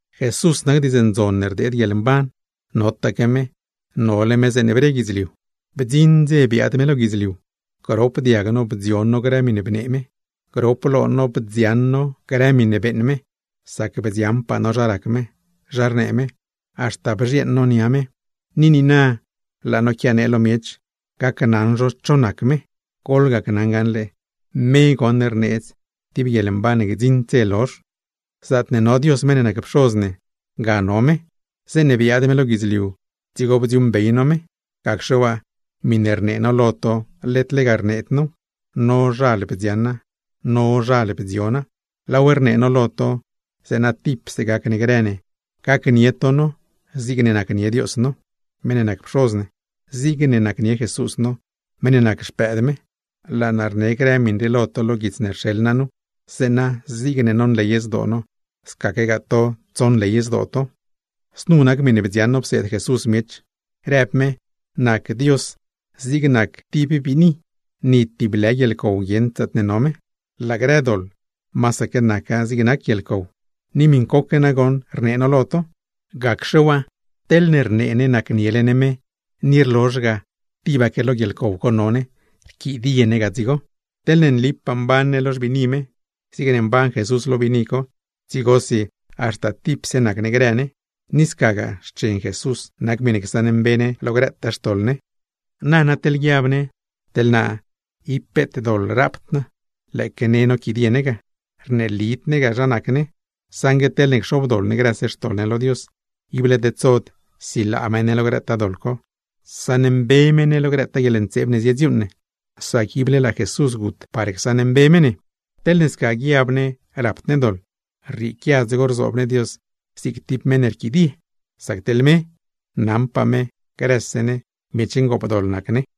Jesús nac Diidz Ndzon ne rdeed guieḻmban. Notaque me, nole me zeeṉe bre guidzliu. Bdziṉ dze biaad me lo guidzliu; grop diag no bdzion no grë miṉe bnee me, grop lo no bdzioṉ no grë miṉe beeṉ me; sac bdzioṉpaa no zha rac me, zha rnee me, haxta bzhieeṉ no nia me. Ni niina laa no quianee lo miech gaṉle cho nac me; goḻgacnaṉ gaṉle, me rneedz tib guieḻmban ne gdziṉd dze lozh. Zaatne no Dios meṉ ne nac Pxoz ne, ga no me; zeeṉe biaad me lo guidzliu dzigo bdziuuṉbey no me. Gacxe waa, miṉe rnee no lo to led lega rneed now; nozhal bdzioṉa, nozhal bdziona. Laaw rnee no lo to, zeeṉa tipse gac ne grë ne, gacnie to no zigne nacnie Dios no (meṉ ne nac Pxoz ne), zigne nacnie Jesús no, meṉ ne nac Xpëëd me. Laa naa rnee grë miṉ rii lo to lo guits ne rxeḻ naa nu, zeeṉa zigne nonley zdoo no scaquegaa to tsonley zdoo to. Znu nac miṉe bdzioṉ no pseed Jesús miech, rëb me: Nac Dios zig nac tib biini, ni tib lë guieḻcow guieṉd zaatne no me; laa grë doḻ, masaque naca zig nac guieḻcow. Ni miṉcoque goṉ rnee no lo to. Gacxe waa, teḻne rnee ne nacniele ne me, ni rlozh ga tibaque lo guieḻcow co no ne, rquidie ne ga dzigo. Teḻne nlipaa mban ne lo xbiini me, zigne mban Jesús lo biini co, dzigosi haxta tipse nac ne grë ne; ni scagaa, xchen Jesús nac miṉe csaṉmbe ne lo grëtaa xtoḻ ne. Nana teḻ guiab ne: Teḻ naa ib peet doḻ rapd naa. Lëëque ne noquidie ne ga, rneelid ne ga zha nac ne. Saṉgue teḻne cxobdoḻ ne grëse xtoḻ ne lo Dios, ible tedsod silaa me ne lo grëtaa doḻ co, saṉmbe me ne lo grëtaa guieḻntseeb ne zidziuuṉ ne; sac ible laa Jesús gut par csaṉmbe me ne. Teḻne sca guiab ne rapd ne doḻ, rrieequia dzigo rzoob ne Dios zig tib meṉ ne rquidie; sac teḻ me, naṉpaa me grëse ne miech ngoopdoḻ nac ne.